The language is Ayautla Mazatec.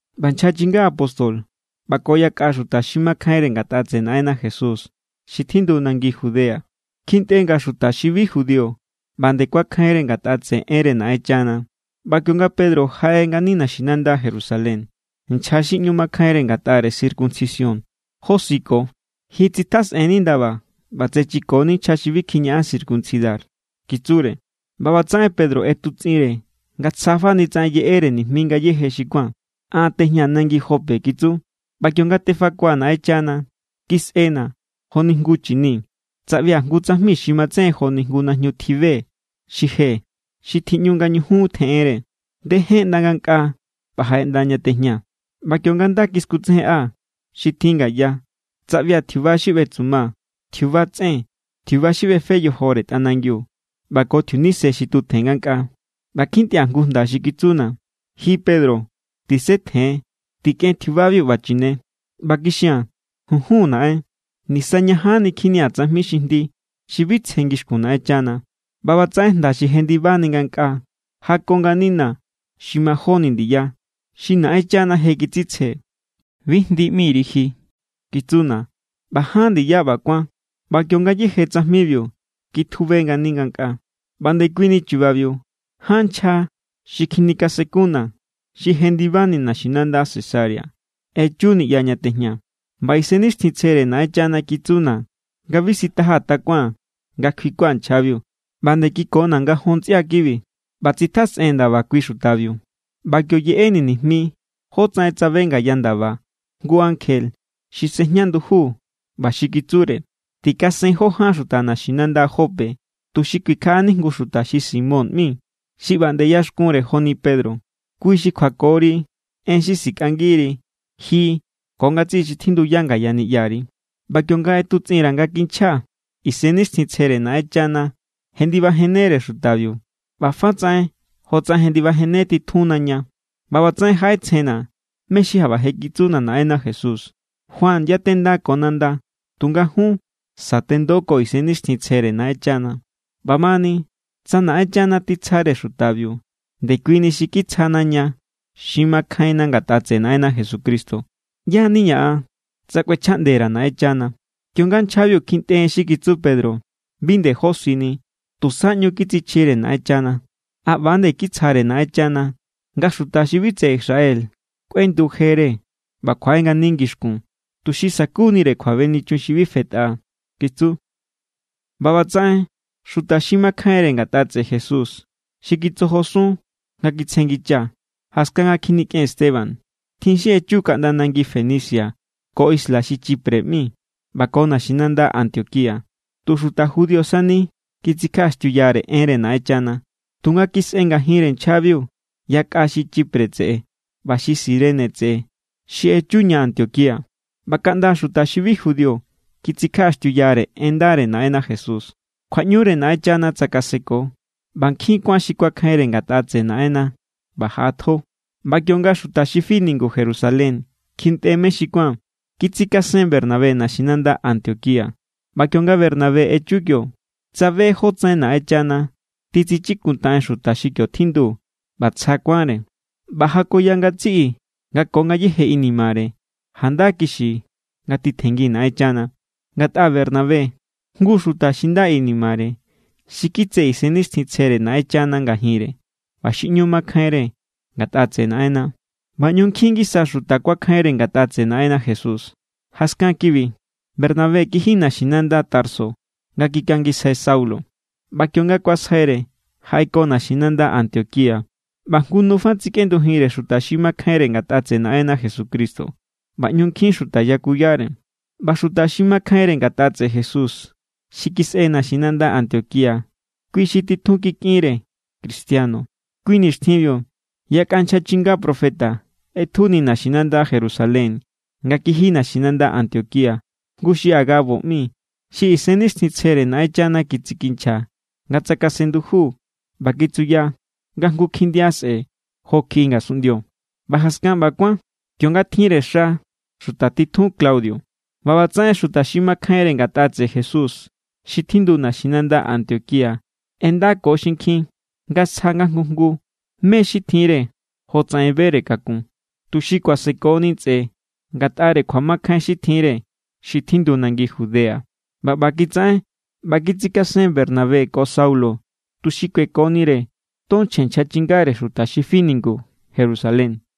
ꞌBa nchja chinga apóstol ꞌba ko yakꞌa xuta xi makjainre ngatꞌa tseꞌe Naꞌenna Jesús xi tjindu nangi Judea kjintꞌe nga xuta xi bi judío ꞌba nde kuakjainre ngatꞌa tseꞌe enre Naꞌenchana. ꞌBa kionga Pedro jaꞌe ngani naxinanda Jerusalén, nchja xi ꞌñu makjainre ngatꞌare circuncisión josiko. —¡Ji tsitjasꞌen=ni ndaba ꞌba tsechiko=ni nchja xi bi kjiñaꞌan circuncidar! —kitsure. ꞌBa ꞌbatsaꞌen Pedro ꞌetutsꞌinre nga tsjafani tsaꞌen yeꞌere nijmi ngayéje xi kuán. —An= tejñaa̱ nangi Jope —kitsu—, ꞌba kionga tefakua̱ Naꞌenchana, kisꞌena̱ joni jngu chini. Tsaꞌbia̱ jngu tsajmi xi matsejen joni jngu najñu tjibe xi je xi tjiꞌñu nga ñujun tjeꞌenre. Ndejen ꞌnda ngankꞌaa ꞌba jaꞌe ꞌnda ña tejñaa̱. ꞌBa kionga nda kiskutsejenꞌa xi tjin ngaya, tsaꞌbia̱ tjiuba xi ꞌbetsuma, tjiuba tsꞌen, tjiuba xi ꞌbefe yojore tꞌanangiu ꞌba ko tjiunise xi tutjen ngankꞌaa. ꞌBa kjintꞌia̱ jngu jnda xi kitsuna̱: “Ji Pedro, tisetjen. Tikꞌen tjiubabiu ꞌba chine.” ꞌBa kixia̱n: “Junjun, Naꞌen. Nisañajanni kjinia̱ tsajmi xi jndi, xi bi tsje ngixkun Naꞌenchana.” ꞌBa ꞌbatsaꞌen jnda xi jendibani ngankꞌaa jako nganina̱ xi majóni ndiya. “Xi Naꞌenchana je kitsitsje, bi jndi ꞌmiri ji”, kitsuna̱. ꞌBa ján ndiya ꞌba kuán, ꞌba kiongayéje tsajmibiu kitjube ngani ngankꞌaa. ’ꞌBa ndekuini chubabiu ján nchja xi kjinikasenkunna̱ xi jendibani naxinanda Cesarea echu niꞌya ña tejñaa̱. ꞌBa Isennixtjintsjere Naꞌenchana kitsuna̱ nga bi sitajaa̱ takuaa̱n nga kjuikua̱ nchjabiu. ꞌBa nde kikona̱ ngajon ntsꞌia kibi, ꞌba tsitjasꞌee̱n ndaba kui xutabiu. ꞌBa kio yeꞌeni̱ nijmi jótsaꞌen tsabe ngaya ndaba jngu ankje xi sejña nduju ꞌba xi kitsure: “Tikasen jó ján xuta naxinanda Jope tuxi kuikjaꞌani jngu xuta xi Simón ꞌmi xi ꞌba nde ꞌyaxkunre joni Pedro. Kui xi kjuakori en xi sikꞌangiri ji ko ngatsiꞌi xi tjindu ngaya niꞌyari.” ’ꞌBa kionga ꞌetutsꞌin_ra̱ nga kinchjaa̱, Isennixtjintsjere Naꞌenchana jendibajennere xutabiu ꞌba fa tsaꞌen jotsaꞌen jendibajenne titjunna ña. ꞌBa ꞌbatsaꞌen jaꞌetsjenna̱ mé= xi jaꞌba je kitsuna Naꞌenna Jesús: “Juan yatenda ko nanda, tunga jun sa̱tendo ko Isennixtjintsjere Naꞌenchana.” ꞌBamani, tsa Naꞌenchana titsjare xutabiu ndekuini xi kitsjana ña xi makjainna ngatꞌa tseꞌe Naꞌenna Jesucristo, ¿ꞌyá= niña̱ an tsa kꞌuechjaꞌnde_ra Naꞌenchana? Kionga nchjabiu kjintꞌe en xi kitsu Pedro, bi nde josini. Tusa ꞌñu kitsichjire Naꞌenchana. —A ꞌba=nde kitsjaꞌndere Naꞌenchana nga xuta xi bi tseꞌe Israel kꞌuendu jere ꞌba kjuaꞌe ngani ngixkun, tuxi sa̱kunire kjuabenichun xi bi fetꞌa —kitsu. ꞌBa ꞌbatsaꞌen xuta xi makjainre ngatꞌa tseꞌe Jesús xi kitsojosun nga kjitsjenngicha jaskan nga kjinikꞌen Esteban, tjin xi echu kaꞌnda nangi Fenicia ko isla xi Chipre ꞌmi ꞌba ko naxinanda Antioquía. Tu xuta judío sani kitsikjaꞌaxtiuyare enre Naꞌenchana. Tunga kisꞌe ngajinre nchjabiu yakꞌa xi Chipre tseꞌe ꞌba xi Cirene tseꞌe xi echu ña Antioquía ꞌba kaꞌnda xuta xi bi judío kitsikjaꞌaxtiuyare en ndare Naꞌenna Jesús. Kjuaꞌñure Naꞌenchana tsakaseko, ꞌba nkjin kuán xi kuakjainre ngatꞌa tseꞌe Naꞌenna ꞌba jaꞌatjo. ꞌBa kionga xuta xi fi ningu Jerusalén kjintꞌe mé xi kuán, kitsikasen Bernabé naxinanda Antioquía. ꞌBa kionga Bernabé echu kio, tsabe jótsaꞌen Naꞌenchana titsichikuntaꞌen xuta xi kio tjindu ꞌba tsja kuánre. ꞌBa jakoya ngatsiꞌi nga ko ngayéje inimare janda kixi nga titjenngi Naꞌenchana. Ngatꞌa Bernabé, jngu xuta xi nda inimare, xi kitse Isennixtjintsjere Naꞌenchana ngajinre ꞌba xi ꞌñu makjainre ngatꞌa tseꞌe Naꞌenna. ꞌBa ꞌñu nkjin ngisa xuta kuakjainre ngatꞌa tseꞌe Naꞌenna Jesús. Jaskan kibi, Bernabé kiji naxinanda Tarso nga kikangisjai Saulo. ꞌBa kionga kuasjaire, jaꞌeko naxinanda Antioquía. ꞌBa jngu nu fa tsikꞌendujinre xuta xi makjainre ngatꞌa tseꞌe Naꞌenna Jesucristo, ꞌba ꞌñu nkjin xuta yakuyare. ꞌBa xuta xi makjainre ngatꞌa tseꞌe Jesús xi kisꞌe naxinanda Antioquía, kui= xi titjun kikꞌinre cristiano. Kui nixtjinbiu yakꞌa nchja chinga profeta ꞌetjuni naxinanda Jerusalén nga kiji naxinanda Antioquía. Jngu xi Agabo ꞌmi, xi Isennixtjintsjere Naꞌenchana kitsikinchja nga tsakasen nduju ꞌba kitsuya nga jngu kjindia sꞌe̱ jo kjiꞌi ngasunꞌndio. ꞌBa jaskan ꞌba kuán, kionga tjinre xa xuta titjun Claudio. ꞌBa ꞌbatsaꞌen xuta xi makjainre ngatꞌa tseꞌe Jesús xi tjindu naxinanda Antioquía ꞌendako xinkjin nga sja nga jngu jngu mé= xi tjinre jotsaꞌen bere kakun, tuxi kuasekoni ntsꞌe ngatꞌare kjuamakjain xi tjinre xi tjindu nangi Judea. ꞌBa ꞌba kitsaꞌen ꞌba kitsikasen Bernabé ko Saulo tuxi kuekonire ton chje nchja chingare xuta xi fi ningu Jerusalén.